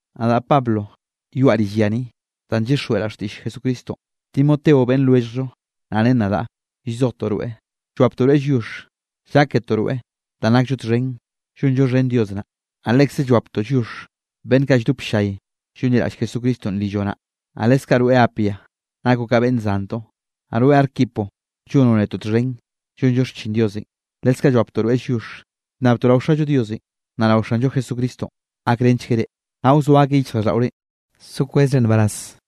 Nadaꞌ Pablo yoaꞌ rill ya ni, danꞌ llyixjweꞌraꞌ xtiꞌll Jesucristonꞌ. Timoteonꞌ beꞌnn lwelljllo naꞌ ren nadaꞌ llzojtoꞌ rweꞌ, llwaptoꞌ rweꞌ lliox lláketoꞌ rweꞌ danꞌ nakllo txhen llonllo xhen Dios naꞌ. Naꞌ lekze llwaptoꞌ lliox beꞌnn kaꞌ lldop ll-llay llonliraꞌll Jesucristonꞌ rilloꞌ naꞌ. Naꞌ leskaꞌ rweꞌ Apia, nakoꞌ ka beꞌnn zantoꞌ, naꞌ rweꞌ Arquipo, llonoꞌ netoꞌ txhen llonllo xchin Diosenꞌ, leskaꞌ llwaptoꞌ rweꞌ lliox. Llnnabtoꞌ rao Xallo Diosenꞌ, naꞌ rao Xanllo Jesucristo gakrenchgueꞌ reꞌ, naꞌ wzoa akeꞌ yichjraꞌlldaꞌorenꞌ so kwezre nbaraz.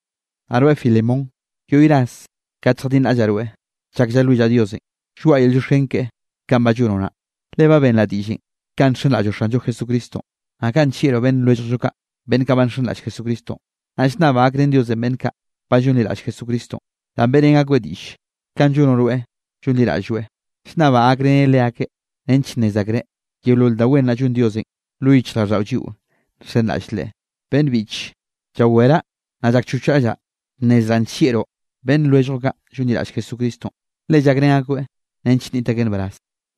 Naꞌ rweꞌ Filemón, yoꞌy ras kate lljadinraꞌllaꞌ rweꞌ chak llalwillaꞌ Diosenꞌ, lloaꞌa yel llioxken keꞌe kanꞌ ba llonoꞌ naꞌ. Le ba benraꞌ diꞌllenꞌ kanꞌ nxenraꞌlloꞌ Xanllo Jesucristonꞌ, naꞌ kanꞌ nllieꞌroꞌ beꞌnn lwelljllo kaꞌ beꞌnn kaꞌ ba nxenraꞌll Jesucristonꞌ. Naꞌ llnnabaꞌ gakrén Diosenꞌ beꞌnn kaꞌ ba llonliraꞌll Jesucristonꞌ, danꞌ beꞌrén akoeꞌ diꞌll kanꞌ llonoꞌ rweꞌ llonliraꞌlloeꞌ. Llnnabaꞌ gakreneꞌ leakeꞌ nench nnez akreꞌ, yeolol da wen naꞌ llon Diosenꞌ lo yichjraꞌlldaꞌo lliꞌo nxenraꞌll Leꞌe. Beꞌnn biꞌche, llaweraꞌ naꞌ llakchochraꞌllaꞌ bnnezraꞌ nllieꞌroꞌ beꞌnn lwelljoꞌ kaꞌ llonliraꞌll Jesucristonꞌ, le llakrén akoeꞌ nench nniꞌt akeꞌ nbaraz.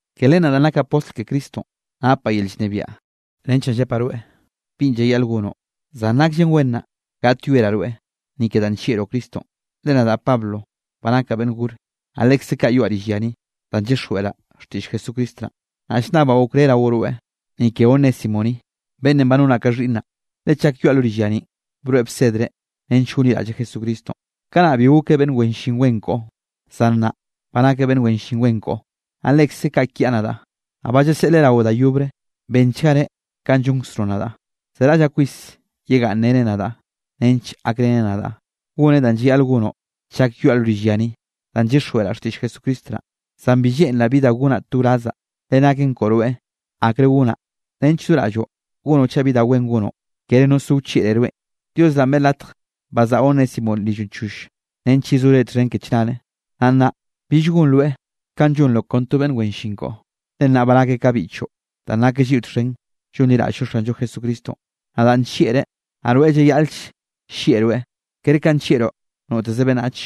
Ke len naꞌ danꞌ nakaꞌ postl ke Cristonꞌ, napaꞌ yel llnebiaꞌ nench naꞌ llepaꞌ rweꞌ binꞌ llayaꞌl gonoꞌ. Zan nakllen wen naꞌ gaꞌtyoeraꞌ rweꞌ, ni ke danꞌ nllieꞌroꞌ Cristonꞌ, le nadaꞌ Pablo ba nakaꞌ beꞌnn gor, naꞌ lekze kaꞌ yoaꞌ rill ya ni, danꞌ llyixjweꞌraꞌ xtiꞌll Jesucristo naꞌ. Naꞌ llnnabaꞌ okré rao rweꞌ, ni ke Onésimo ni, beꞌnnenꞌ ba nonaꞌ ka xhiꞌnnaꞌ. Le chak yoaꞌ lo rill ya ninꞌ, broeꞌ bsedreꞌ nench gonliraꞌlleꞌ Jesucristonꞌ. Kanaꞌ bi gokeꞌ beꞌnn wen llin wen koꞌo, zan nnaꞌ ba nakeꞌ beꞌnn wen llin wen koꞌo, naꞌ lekze kaꞌ kiaꞌ nadaꞌ. Naꞌ ba llaseꞌleꞌ raoꞌ da yobre, benchgareꞌ kanꞌ llonkzroꞌ nadaꞌ. Zeraꞌllaꞌ kwis yegaꞌnnreneꞌ nadaꞌ nench gakreneꞌ nadaꞌ, goneꞌ danꞌ llayaꞌl gonoꞌ chak yoaꞌ lo rill ya ni, danꞌ llyixjweꞌraꞌ xtiꞌll Jesucristo naꞌ. Zan bi lleꞌnraꞌ bi da gonaꞌ to wrazzaꞌ, le naken koꞌo rweꞌ nneꞌo akre gonaꞌ, nench do raꞌlloꞌ gonoꞌ chaꞌ bi da wen gonoꞌ, kere no zo wchieꞌre rweꞌn. Dios naꞌn beꞌe latj bazaꞌa Onésimonꞌ rilloꞌn choll, nench yezore txhen ke chnare. Naꞌ nnaꞌ bill gonroeꞌ ka llonroꞌ kon to beꞌnn wen llin koꞌo, le nnaꞌ ba nakeꞌ ka biꞌchoꞌ danꞌ nakeꞌ lliꞌo txhen llonliraꞌll-llo Xanllo Jesucristonꞌ. Nadaꞌ nllieꞌreꞌ, naꞌ rweꞌ llayaꞌl-ll llieꞌroeꞌ, kere kanꞌ nllieꞌroꞌ noteze beꞌnnach,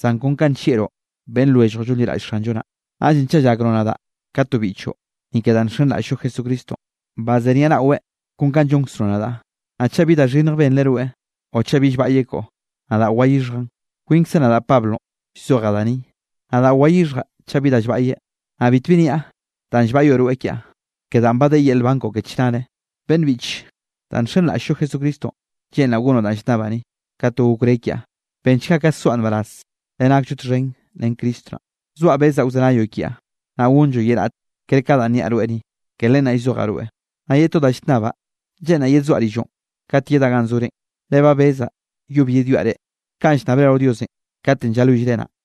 zan kon kanꞌ nllieꞌroꞌ beꞌnn lwelljoꞌ llonliraꞌll Xanllo naꞌ. Naꞌllenꞌ chaꞌ llakroꞌ nadaꞌ ka to biꞌchoꞌ, ni ke danꞌ nxenraꞌll-llo Jesucristonꞌ, bazeniaꞌnaꞌweꞌ kon kanꞌ llonkzroꞌ nadaꞌ. Naꞌ chaꞌ bi da xhinnj benreꞌ rweꞌ o chaꞌ bi llbaꞌyeꞌ koꞌo, nadaꞌ wayixhjaꞌn. Kwinkzaꞌ nadaꞌ Pablo llzojaꞌ da ni, nadaꞌ wayixhjaꞌ chaꞌ bi da llbaꞌyeꞌ. Naꞌ bitbi niaꞌ danꞌ llbaꞌyoꞌ rweꞌ kiaꞌ, ke danꞌ ba de yel nban koꞌo ke chnare. Beꞌnn biꞌche, danꞌ nxenraꞌll-llo Jesucristonꞌ, lleꞌnraꞌ gonoꞌ danꞌ llnnabaꞌ ni, ka to okré kiaꞌ. Benchga ka soaꞌ nbaraz, le nakllo txhen ren Cristo naꞌ. Zoaꞌ bezaꞌ wzenayoꞌ kiaꞌ, naꞌ gonlloꞌ ye raꞌt ker ka danꞌ niaꞌ rweꞌ ni, ke len naꞌ llzojaꞌ rweꞌ. Naꞌ ye to da llnnabaꞌ, lleꞌnraꞌ yedsoaꞌ rilloꞌn kat yedaꞌ ganꞌ zorenꞌ. Le ba bezaꞌ yob yedwiaꞌ reꞌ, kanꞌ llnnabre rao Diosenꞌ katenꞌ llalwillreꞌ naꞌ.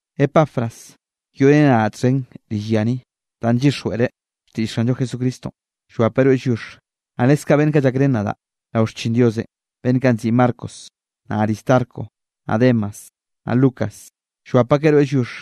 Epafras yoꞌreneꞌ nadaꞌ txhen rill ya ni, danꞌ llyixjweꞌreꞌ xtiꞌll Xanllo Jesucristonꞌ, llwapeꞌ rweꞌ lliox. Naꞌ leskaꞌ beꞌnn kaꞌ llakrén nadaꞌ rao xchin Diosenꞌ, beꞌnn kaꞌ nziꞌi Marcos, naꞌ Aristarco, naꞌ Demas, naꞌ Lucas, llwap akeꞌ rweꞌ lliox.